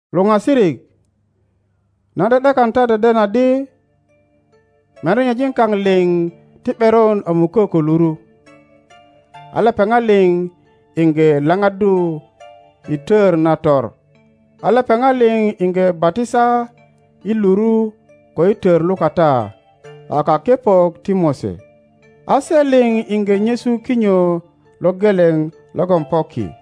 Luŋasirik, nan ’de ’dekan ta deden adi, merenyejin kaŋ liŋ ti ’beron a mukö ko luru, a lepeŋat liŋ iŋge lapaddu i Tör Nator, a lepeŋat liŋ iŋge batisa i luru ko i tör lukata a kakepok ti Mose. A se liŋ iŋge nyesu kinyo lo geleŋ logon po ki,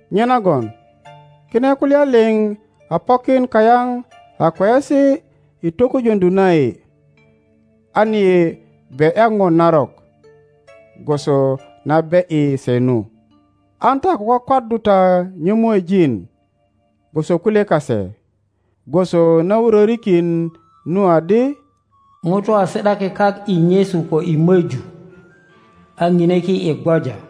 Nyenagon kine kulya liŋ a pokin kayaŋ a kweyesi i tokujöŋdu na yi, an yi be ’ya po narok, gwoso na ’beyi se nu. An ta ko kwakwaddu ta nyömuejin gwoso kulye kase, gwoso na wurörikin nu adi, Ŋutu a si ’daki kak i nyesu ko i möju, a ŋine ki i gwoja.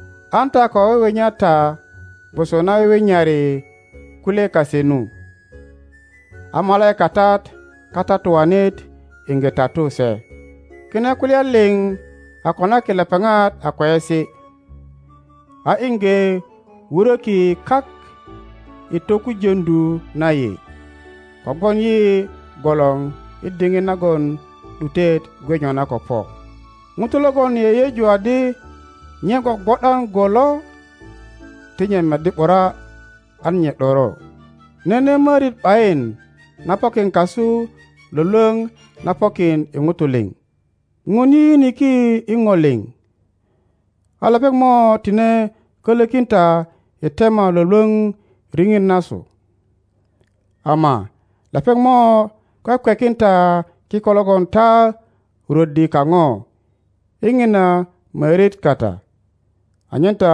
An ta ko wiwinya ta gwoso na wiwinyari kulye kase nu, a malaikatat Katatuanit iŋge tatu se. Kine kulya liŋ a konaki lepeŋat a kweyesi, a iŋge wuröki kak i tokujöŋdu na yi, kogwon yi gwolor i diŋit nagon ’dutet gwe nyona ko po. Ŋuto logon yeyeju adi nye gwogwo ’dan go lo, ti nye meddi ’bura an nye ’doro. Nene mörit ’bayin na pokin kasu lwölwöŋ na pokin i ŋuto liŋ. Ŋun yiyiniki i po liŋ, a lepeŋ mo tine kölökin ta i tema lwölwöŋ riŋit nasu, ama lepeŋ mo kwekwekin ta kiko logon ta rwöddi kaŋo i ŋina mörit kata, anyen ta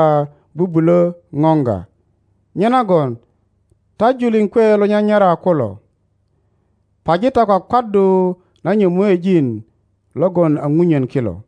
bubulö poŋga. Nyenagon ta julin kwe lo nyanyara kulo, paji ta kwakwaddu na nyömuejin logon a punyen kilo.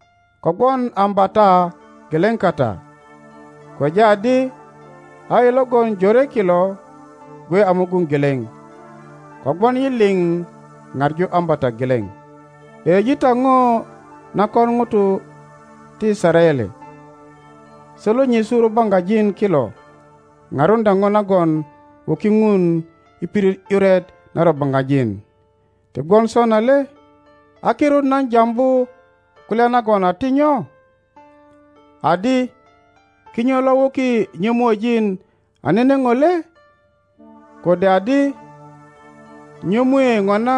Kogwon ambata geleŋ kata, kweja adi a yi logon jore kilo gwe a mugun geleŋ, kogwon yi liŋ paŋu ambata geleŋ. Yeyeji ta po na kon ŋuto ti Yisaraele. Se lo nyesu rubaŋgajin kilo paruŋdya po nagon wuki Ŋun i pirit ’yuret na rubaŋgajin, ti gwon sona le? a kirut nan jambu kulya nagon a ti nyo? Adi kinyo lo wuki nyömuejin a nene po le? Kode adi nyömue ŋona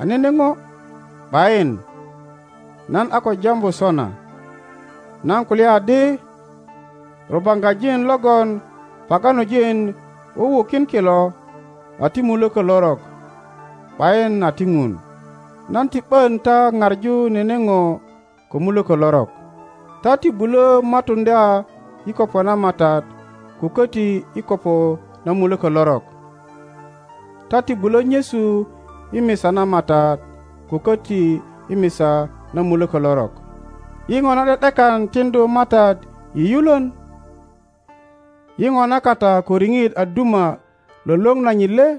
a nene po? ’Bayin, nan a ko jambu sona. Nan kulya adi, Rubaŋgajin logon paganojin wuwukin kilo a ti mulökö lorok, ’bayin a ti Ŋun. Nan ti ’bön ta paŋu nene po ko mulökö lorok. Ta ti bulö matuŋdya i kopo na Matat ko köti i kopo na mulökö lorok. Ta ti bulö nyesu i misa na Matat ko köti i misa na mulökö lorok. yi ŋona ’de ’dekan tiŋdu Matat i yulön? Yi ŋona kata ko riŋit a duma lwölwöŋ nanyit le?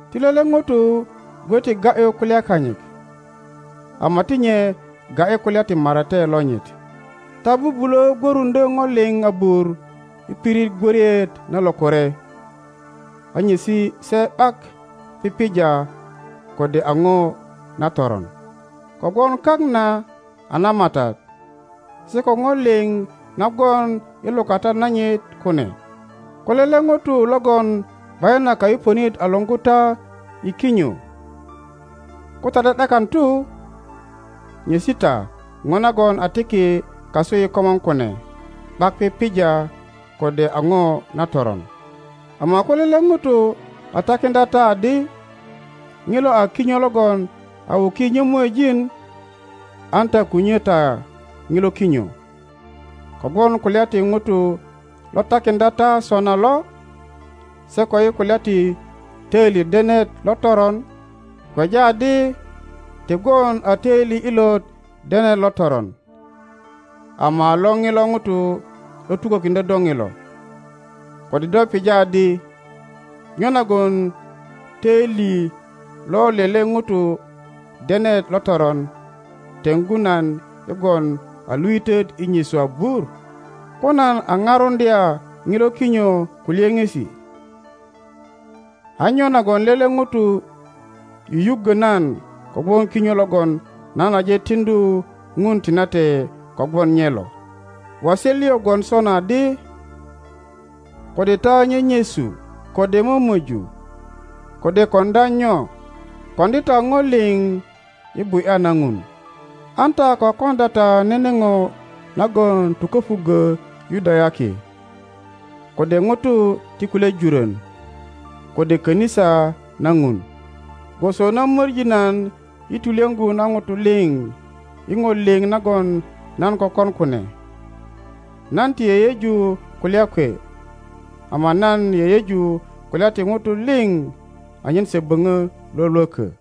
Ti lele ŋuro gwe ti ga ’yu kulya kanyit, ama ti nye ga ’yi kulya ti marate lonyit. Ta bubulö gwöruŋdyö po liŋ abur i pirit gwörit na lokore a nyesi se ’bak pipija kode a po na toron. Kogwon kak na a na Matat se ko po liŋ na gwon i lukata nanyit kune. Ko lele ŋuro logon ’bayin a kayupönit a luŋgu ta i kinyo, ko ta ’de ’dekan tu, nyesi ta po nagon a tiki kasu i komor kune ’bak pipija kode a po na toron. Ama ko lele ŋuro a takiŋdya ta adi, Ŋilo a kinyo logon a wuki nyömuejin, an ta ko nyö ta ŋilo kinyö, kogwon kulya ti ŋuro lo takiŋdya ta sona lo, se ko i kulya ti töili denet lo toron— kweja adi, ti gwon a töili ilot denet lo toron, ama a lo ŋilo ŋuro lo tukökiŋdyö do ŋilo. Kode do pija adi, Nyo nagon töili lo lele ŋuro denet lo toron teŋgu nan i gwon a luitöt i nyesu abur? Ko nan a paruŋdya ŋilo kinyo ko lyöŋesi, a nyo nagon lele ŋuro yuyuggö nan kogwon kinyo logon nan aje tiŋdu Ŋun tinate kogwon nye lo? Waset lio gwon sona adi, Kode ta nyenyesu, kode mömoju, kode koŋdya nyo, koŋdi ta po liŋ i bu ’ya na Ŋun. An ta ko koŋdya ta nene po nagon tuköpuggö Yudayaki, kode ŋuto ti kulye jurön, kode kanisa na Ŋun. Gwoso na möŋi nan i tulyöŋgu na ŋuto liŋ i po liŋ nagon nan kökon kune. Nan ti yeyeju kulya kwe, ama nan yeyeju kulya ti ŋuto liŋ anyen se böpö lwölwökö.